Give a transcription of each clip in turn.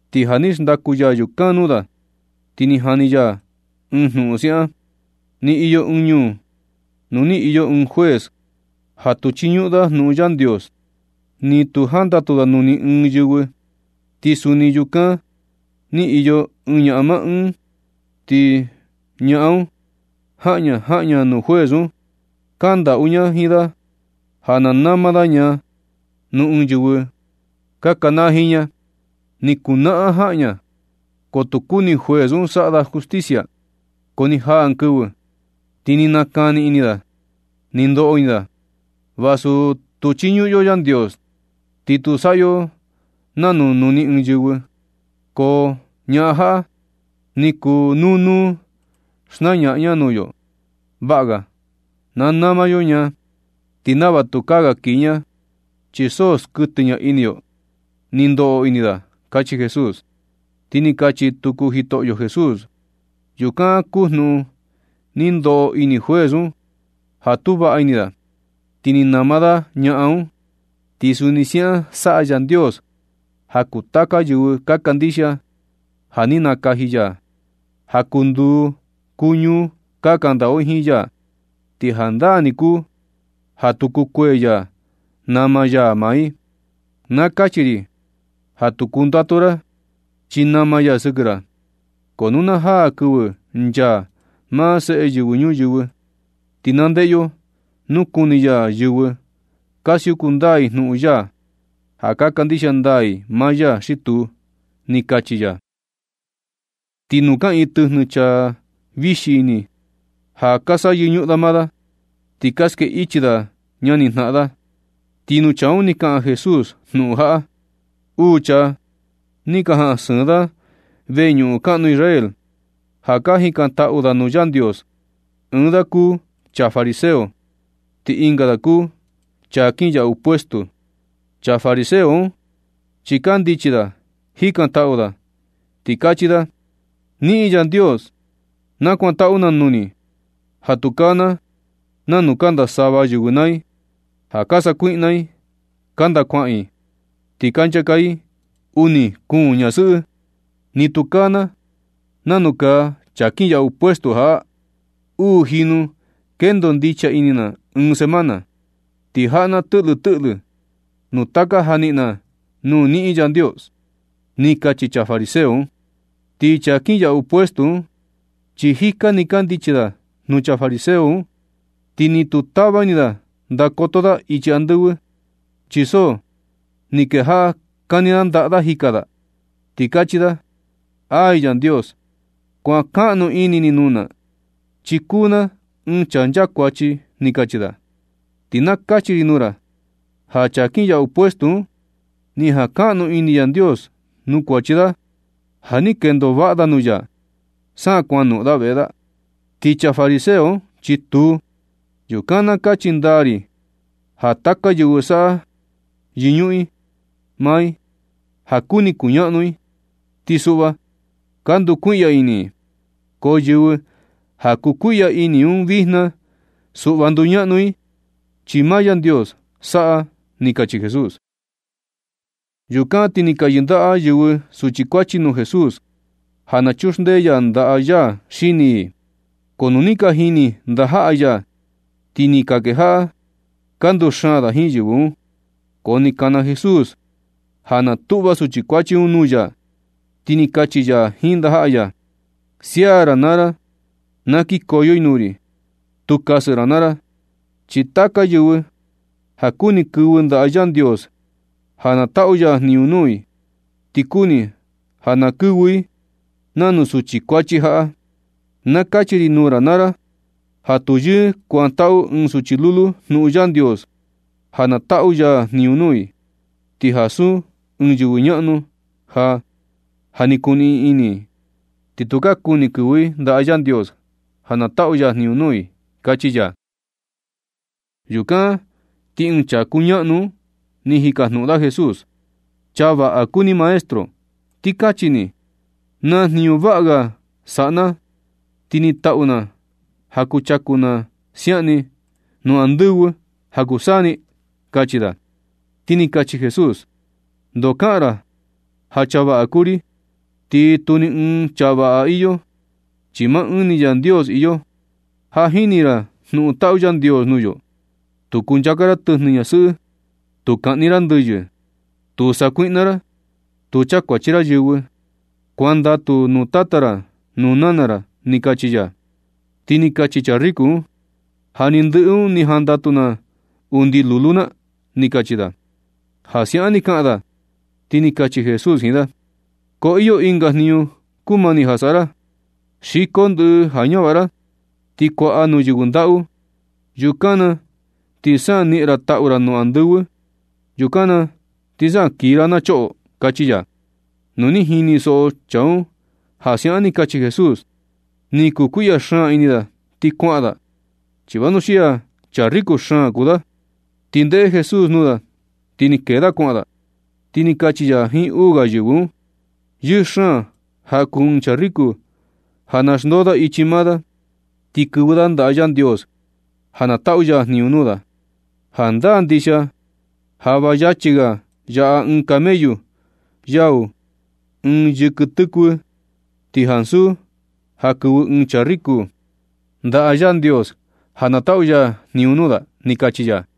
Ti ja ni xndaku ya yukan nuu da, ti ni jani ya ɨɨn jnuꞌun siaꞌan: ―Ni iyo ɨɨn ñuu nuu ni iyo ɨɨn juez ja tu chiñuꞌun da jnuꞌun Yandios, ni tu jandatu da nuu ni ɨɨn yɨvɨ. Ti suni ñuu yukan ni iyo ɨɨn ñaꞌan maa ɨɨn. Ti ñaꞌan un jaꞌan ña, jaꞌan ña nuu juez un, kandaꞌu ña jiin da ja na nama da ña nuu ɨɨn yɨvɨ ka kanaa jiin ña. Ni kuu naꞌan jaꞌan ña, ko tu kuni juez un saꞌa da justicia. Ko ni jaa ɨɨn kɨvɨ, ti ni nakani ini da ti ni ndoꞌo ini da: “Vasu tu chiñuꞌun yo Yandios, ni tu saꞌa yo nanu nuu ni ɨɨn yɨvɨ, ko ñaꞌan jaꞌa ni kuu nuu nuu xnañaꞌan ña nuu yo. Vaꞌa ga ja na nama yo ña, ti nava tukaa ga kiji ña chi so skuɨtɨ ña ini yo”, ni ndoꞌo ini da ―kachi Jesús. Ti ni kachi tuku Jitoꞌyo Jesús: ―Yukan kuu jnuꞌun ni ndoꞌo ini juez un ja tu vaꞌa ini da, ti ni nama da ñaꞌan un. Ti suni siaꞌan saꞌa Yandios ja kuu taka yɨvɨ ka kandixia ja ni nakaji ya, ja kuu nduu kuu ñuu ka kandaꞌu i jiin ya. Ti jandaa ni kuu ja tu kukuee ya nama ya maa i. Na kachi ri ja tu kundatu ra, chi nama ya sɨkɨ ra. Ko nu na jaa kɨvɨ nchaa maa Seꞌe Yɨvɨ Ñuyɨvɨ, ti na ndeꞌe yo nu kuni ya yɨvɨ ka siuku ndaa i jnuꞌun ya, ja ka kandixia ndaa i maa ya xi tuu ―ni kachi ya. Ti nuu kaꞌiin tɨjnɨ chaa vixi ini, ja ka saꞌa yɨñuꞌun da maa da, ti ka skee ichi da ñanijnaꞌan da. Ti nuu chaa un ni kaꞌan Jesús jnuꞌun jaꞌa: ―Uu chaa ni ka jaꞌan sɨɨn da veñuꞌun kaꞌnu Israel ja ka jikantaꞌu da nuu Yandios. Ɨɨn da kuu chaa fariseo, ti ɨnga da kuu chaa kinyaꞌu puesto. Chaa fariseo un chi kandichi da jikantaꞌu da, ti kachi da: “Niꞌin Yandios, nakuantaꞌu na nuu ni ja tukaa na nanu kanda sava yɨvɨ naa i, ja ka sakuiꞌna i, kanda kuaꞌan i, ti ka nchaka i uni kuun ñasɨꞌɨ, ni tukaa na nanu kaa chaa kinyaꞌu puesto jaꞌa. Uu jinu kendo ndicha ini na ɨɨn semana, ti jaꞌa na tɨꞌlɨ tɨꞌlɨ nuu taka ja niꞌin na nuu niꞌin Yandios”, ni kachi chaa fariseo un. Ti chaa kinyaꞌu puesto un, chi jika ni kandichi da nuu chaa fariseo un, ti ni tu ni tava ini da ndakoto da ichi andɨvɨ, chi so ni kejaꞌa kani da ndaꞌa da jika da, ti kachi da: “Ay Yandios, kuankaꞌnu ini ni nuu na, chi kuu na ɨɨn chaa nchakuachi”, ni kachi da. Ti na kachi ri nuu ra ja chaa kinyaꞌu puesto un, ni jankaꞌnu ini Yandios nuu kuachi da ja ni kendo vaꞌa da nuu ya, sa kuan noꞌon da veꞌe da. Ti chaa fariseo un, chi tuu. Yukan, na kachi ndaa ri ja taka yɨvɨ saꞌa yɨñuꞌun i maa i ja kuni kuñaꞌnu i, ti suꞌva ka ndukuiꞌya ini i. Ko yɨvɨ ja kukuiꞌya ini un vijna suꞌva nduñaꞌnu i, chi maa Yandios saꞌa ―ni kachi Jesús. Yukan ti ni ka yɨndaꞌa yɨvɨ suchi kuachi nuu Jesús ja na chuxndee ya ndaꞌa ya xini i. Ko nu ni ka jini ndajaꞌa ya, ti ni ka kejaꞌa ka nduxaan da jiin yɨvɨ un. Ko ni kana Jesús ja na tuꞌva suchi kuachi un nuu ya, ti ni kachi ya jiin ndajaꞌa ya: ―Sia naa ra na kikoyo i nuu ri ti tu kasɨ ra naa ra. Chi taka yɨvɨ ja kuni kɨvɨ ndaꞌa Yandios ja na taꞌu ya jniñu nuu i, ti kuni ja na kɨvɨ i nanu suchi kuachi jaꞌa. Na kachi ri nuu ra naa ra ja tu yɨɨ kuantaꞌu ɨɨn suchi lulu jnuꞌun Yandios ja na taꞌu ya jniñu nuu i, ti ansu ɨɨn yɨvɨ ñaꞌnu ja, ja ni kuniꞌin ini, ti tu ka kuni kɨvɨ i ndaꞌa Yandios ja na taꞌu ya jniñu nuu i ―kachi ya. Yukan ti ɨɨn chaa kuñaꞌnu un ni jikajnuꞌun da Jesús: ―Chaa vaꞌa kuu ni, maestro. Ti kachi ni, ¿naa jniñu vaꞌa saꞌa na ti niꞌin taꞌu na ja kuchaku na siaꞌan ni nuu andɨvɨ ja kuu saa ni? ―kachi da. Ti ni kachi Jesús: ―Ndoo kaꞌan ra ja chaa vaꞌa kuu ri, ti tu ni ɨɨn chaa vaꞌa iyo, chi maa ɨɨn ni Yandios iyo. Ja jini ra jnuꞌun taꞌu Yandios nuu yo: “Tu kunchaka ra tɨjnɨ ñasɨꞌɨ. Tu kaꞌni ra ndɨyɨ. Tu sakuiꞌna ra. Tu chakuachi ra yɨvɨ. Kuandatu nuu tata ra, nuu nana ra” ―ni kachi ya. Ti ni kachi chaa riko un: ―Ja ni ndɨꞌɨ un ni jandatu na undi lulu na ―ni kachi da. Ja siaꞌan ni kaꞌan da, ti ni kachi Jesús jiin da: ―Ko iyo ɨnga jniñu kumani ja saꞌa ra. Xiko ndɨꞌɨ ja ñavaꞌa ra ti kuaꞌa nuu yɨvɨ ndaꞌu. Yukan na ti sa niꞌin ra taꞌu ra undi andɨvɨ. Yukan na ti sa kii ra na choꞌo ―kachi ya. Nu ni jinisoꞌo chaa un ja siaꞌan ni kachi Jesús, ni kukuiꞌya xaan ini da ti kuaꞌan da, chi vanuxia chaa riko xaan kuu da. Ti ndeꞌe Jesús nuu da ni kee da kuaꞌan da, ti ni kachi ya jiin uu ga yɨvɨ un: ―Yɨɨ xaan ja kuu ɨɨn chaa riko ja na xndoo da ichi maa da, ti kɨvɨ da ndaꞌa Yandios ja na taꞌu ya jniñu nuu da. Jandaa ndixia ja va yachi ga yaꞌa ɨɨn camellu yau ɨɨn yɨkɨ tɨkuɨ, ti ansu ja kɨvɨ ɨɨn chaa riko ndaꞌa Yandios ja na taꞌu ya jniñu nuu da ―ni kachi ya.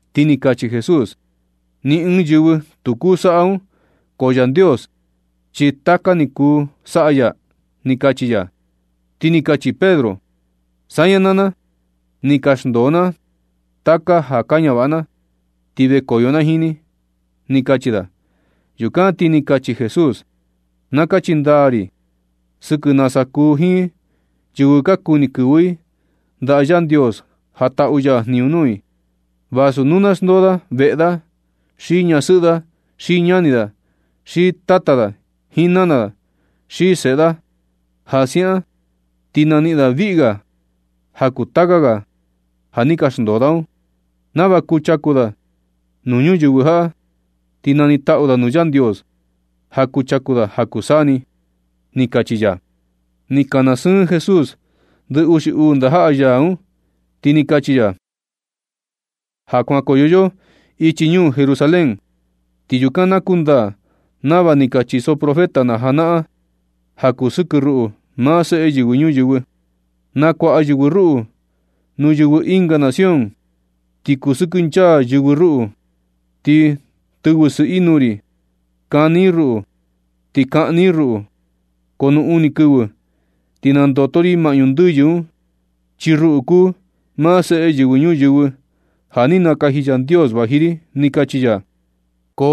Ti ni kachi Jesús: ―Ni ɨɨn yɨvɨ tu kuu saꞌa un, ko Yandios chi taka ni ja kuu saꞌa ya ―ni kachi ya. Ti ni kachi Pedro: ―Saña naa na, ni ka xndoo na taka ja ka ñavaꞌa na ti vekoyo na jiin ni ―ni kachi da. Yukan ti ni kachi Jesús: ―Na kachi ndaa ri sɨkɨ nasa kuu jiin yɨvɨ ja kuni kɨvɨ i ndaꞌa Yandios ja taꞌu ya jniñu nuu i, vasu nu na xndoo da veꞌe da, xi ñasɨꞌɨ da, xi ñani da, xi tata da jiin nana da, xi seꞌe da. Ja siaꞌan ti naniꞌin da viꞌga ja kuu taka ga ja ni ka xndoo da un, nava kuchaku da nuu ñuyɨvɨ jaꞌa, ti nanitaꞌu da nuu Yandios ja kuchaku da ja kuu saa ni―ni kachi ya. Ni kana sɨɨn Jesús ndɨ uxi uu ndajaꞌa ya un, ti ni kachi ya: ―Ja kuankoyo yo ichi ñuu Jerusalén, ti yukan na kundaa nava ni ka chiso profeta na janaꞌan ja kuu sɨkɨ ruꞌu, maa Seꞌe Yɨvɨ Ñuyɨvɨ. Nakuaꞌa yɨvɨ ruꞌu nuu yɨvɨ ɨnga nación, ti kusɨkɨnchaa yɨvɨ un ruꞌu, ti tɨvɨ sɨꞌɨ i nuu ri, kani i ruꞌu, ti kaꞌni i ruꞌu. Ko nu uni kɨvɨ ti nandoto ri maꞌñu ndɨyɨ un chi ruꞌu kuu maa Seꞌe Yɨvɨ Ñuyɨvɨ, ja ni nakaji Yandios vaji ri ―ni kachi ya. Ko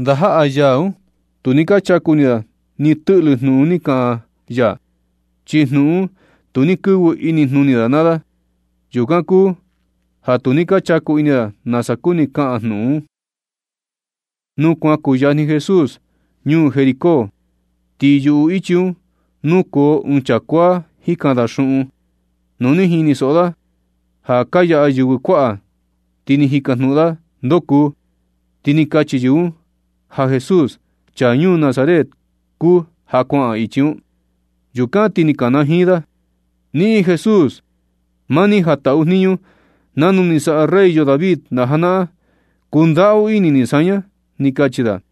ndajaꞌa ya un, tu ni ka chaku ini da ni tɨꞌlɨ jnuꞌun ni kaꞌan ya, chi jnuꞌun un tu ni kɨvɨ inijnuni da naa da. Yukan kuu ja tu ni ka chaku ini da nasa kuni kaꞌan jnuꞌun un. Nu kuan kuyajni Jesús ñuu Jericó, ti yuꞌu ichi un nukoo ɨɨn chaa kuaa jikan da xuꞌun. Nu ni jinisoꞌo da ja ka yaꞌa yɨvɨ kuaꞌa, ti ni jikajnuꞌun da ndoo kuu. Ti ni ka kachi yɨvɨ un ja Jesús, chaa ñuu Nazaret kuu ja kuaꞌan ichi un. Yukan ti ni kanajiin da: ―¡Niꞌin Jesús! Maa ni ja taꞌu jniñu nanu ni saꞌa rey yo David na janaꞌan, kundaꞌu ini ni saña ―ni kachi da.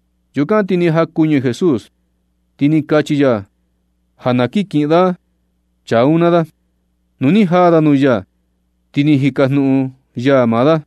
Yukan ti ni jakuñɨ Jesús, ti ni kachi ya ja na kin kiꞌin da chaa un naa da. Nu ni jaa da nuu ya, ti ni jikajnuꞌun ya maa da: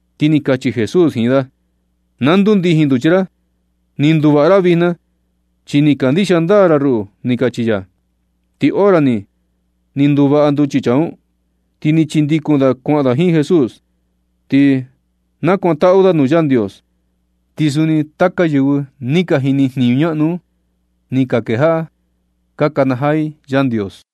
Ti ni kachi Jesús jiin da: ―Na ndundijin nduchi ra. Ni nduvaꞌa ra vijna na chi ni kandixia ndaa ra ruꞌu ―ni kachi ya. Ti hora ni, ni nduvaꞌa nduchi chaa un, ti ni chindikun da kuaꞌan da jiin Jesús, ti nakuantaꞌu da nuu Yandios. Ti suni taka yɨvɨ ni ka jini jniñu ñaꞌnu un, ni ka kejaꞌa ka nakanajaa i Yandios.